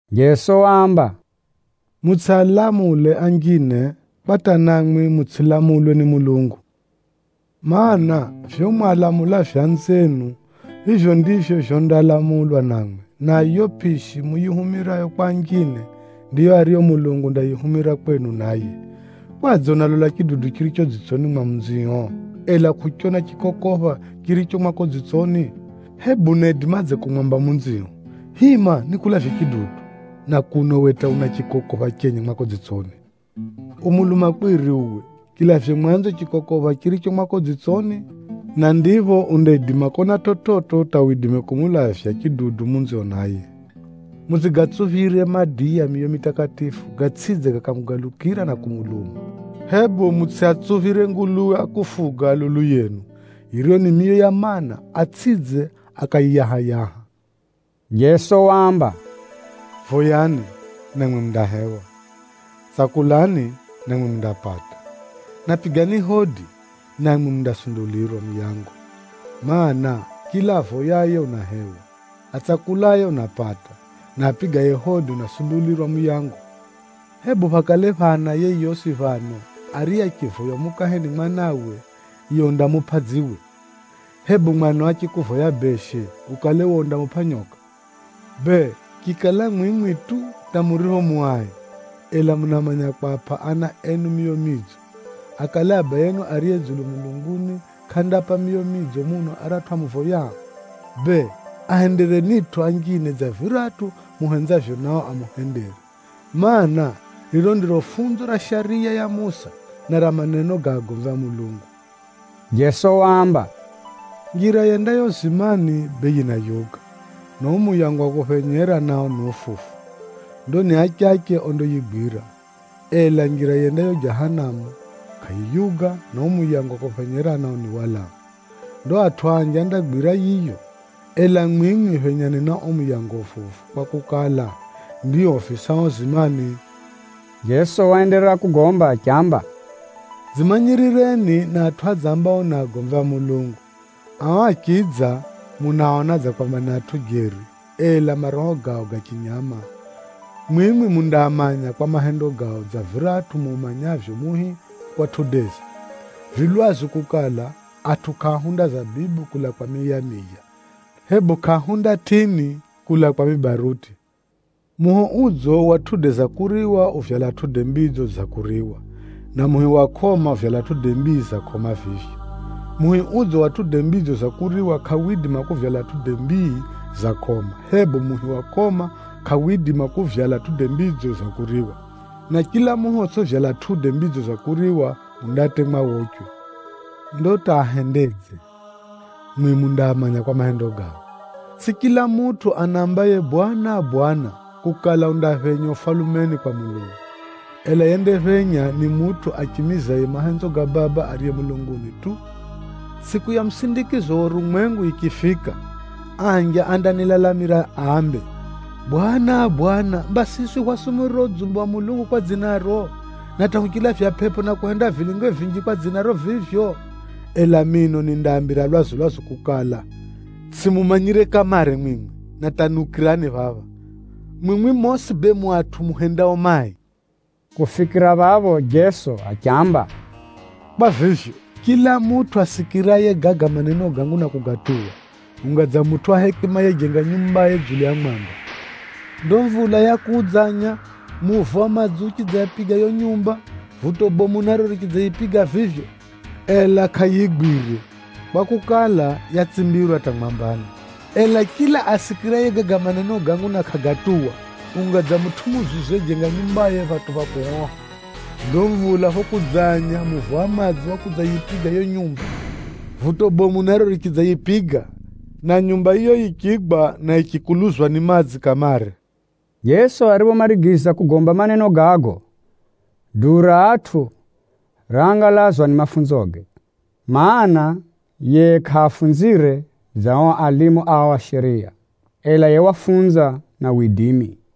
Jeso waamba, “Mutsʼialamule anjine, kwa hata namwi mutsʼilamulwe ni Mulungu. Maana, vivyo mwalamulavyo anzienu, vivyo ndivyo vyondalamulwa namwi. Na yiyo pʼishi muyihumirayo kwa anjine, ndiyo ariyo Mulungu undayihumira kwenu naye. Kwadze unalola chidudu chiricho dzitsoni mwa munzio, ela kʼuchona chikokopha chiricho mwako dzitsoni? Hebu unaidimadze kumwamba munzio, ‘Hima nikulavye chidudu,’ na kuno uwe hata una chikokopha chenye mwako dzitsoni? Uwe mulumakwiri uwe! Chilavye mwanzo chikokopha chiricho mwako dzitsoni, na ndipho undaidima kona chividzo hata widime kumulavya chidudu munzio naye. “Mutsʼigatsuphire madiya miyo mitakatifu, gatsʼidze gakamugalukira na kumuluma, hebu mutsʼiatsuphire nguluwe a kufuga lulu yenu, yiriyo ni miyo ya maana, atsʼidze akayiyaha-yaha.” Jeso waamba, “Voyani, namwi mundahewa, tsakulani, namwi mundapata, na pigani hodi, namwi mundasundulirwa muyango. Maana, chila avoyaye unahewa, atsakulaye unapata, na apigaye hodi unasundulirwa muyango. Hebu phakale phana yeyosi phano, ariye achivoywa mukahe ni mwanawe, yiye undamupʼa dziwe? Hebu mwanao achikuvoya beshe, ukale we undamupʼa nyoka? Bee, chikala mwimwi tu hata muripho mu ai, ela munamanya kwapʼa ana enu miyo midzo, akale Abayenu ariye dzulu mulunguni kʼandaapʼa miyo midzo muno aratʼu amuvoyao? Bee, ahenderenitʼo anjine kahi za gosi dza viratʼu muhenzavyo nao amuhendere, mana, riro ndiro funzo ra Shariya ya Musa, na ra maneno ga agomvi a Mulungu.” Jeso waamba, “Njira yendayo uzimani bee yinayuga, na uo muyango wa kuphenyera nao ni ufufu. Ndo ni achache ondayigwira. Ela njira yendayo Jahanamu, kʼayiyuga na uo muyango wa kuphenyera nao ni walamu. Ndo atʼu anji andagwira yiyo. Ela mwimwi phenyani na uo muyango ufufu kwakukala, ndio ufisao uzimani.” Jeso waenderera kugomba achiamba, “Dzimanyirireni na atʼu adzambao ni agomvi a Mulungu. Ao achidza, munaaona dza kwamba ni atʼu jeri, ela maroho gao ga chinyama. Mwimwi mundaamanya kwa mahendo gao dza viratʼu muumanyavyo muhi kwa matundage. Vi lwazu kukala, atʼu kʼaahunda zabibu kulaa kwa mihi ya miya, hebu kʼaahunda tʼini kulaa kwa mibaruti. Muhi udzo wa matunda ga kuriwa uvyala matunda madzo ga kuriwa, na muhi wa kʼoma, uvyala matunda mai ga kʼoma vivyo. Muhi udzo wa matunda madzo ga kuriwa kʼawidima kuvyala matunda mai ga kʼoma, hebu muhi wa kʼoma kʼawidima kuvyala matunda madzo ga kuriwa. Na chila muhi otsʼivyala matunda madzo ga kuriwa undatemwa wochwe. Ndo hata ahendedze, mwimwi mundaamanya kwa mahendo gao. “Tsʼi chila mutʼu anambaye, ‘Bwana, Bwana,’ kukala undaphenya Ufalumeni kwa Mulungu, ela yendaphenya ni mutʼu achimizaye mahenzo ga Baba ariye mulunguni tu. Tsʼiku ya musindikizo wa urumwengu yichifika, anji andanilalamira ambe, ‘Bwana, Bwana! Mba siswi hwasumurira udzumbe wa Mulungu kwa dzinaro, na hata huchilavya pʼepʼo na kuhenda vilinge vinji kwa dzinaro vivyo.’ Ela mino nindaambira lwazu-lwazu kukala, ‘Tsʼimumanya kamare mwimwi, na hata niukirani phapha! Mwimwi mosi bee mu atʼu muhendao mai.’” Kufikira phapho Jeso achiamba, “Kwa vivyo, chila mutʼu asikiraye gaga maneno gangu na kugatuwa, unga dza mutʼu wa hekima yejenga nyumbaye dzulu ya mwamba. Ndo mvula yakudzanya, muvo wa madzi uchidzayipiga yiyo nyumba, vuto bomu naro richidzayipiga vivyo, ela kʼayigwire, kwakukala, yatsimbirwa hata mwambani. Ela chila asikiraye gaga maneno gangu na kʼagatuwa, unga dza mutʼu muzuzu yejenga nyumbaye phatʼu pha kuhoha. Ndo mvula phokudzanya, muvo wa madzi wakudzayipiga yiyo nyumba, vuto bomu naro richidzayipiga, na nyumba yiyo yichigwa, na yichikuluzwa ni madzi kamare!” Jeso ariphomarigiza kugomba maneno gago, duu ra atʼu raangalazwa ni mafunzoge, mana, yiye kʼafunzire dza ao alimu ao a shariya, ela yiye wafunza na widimi.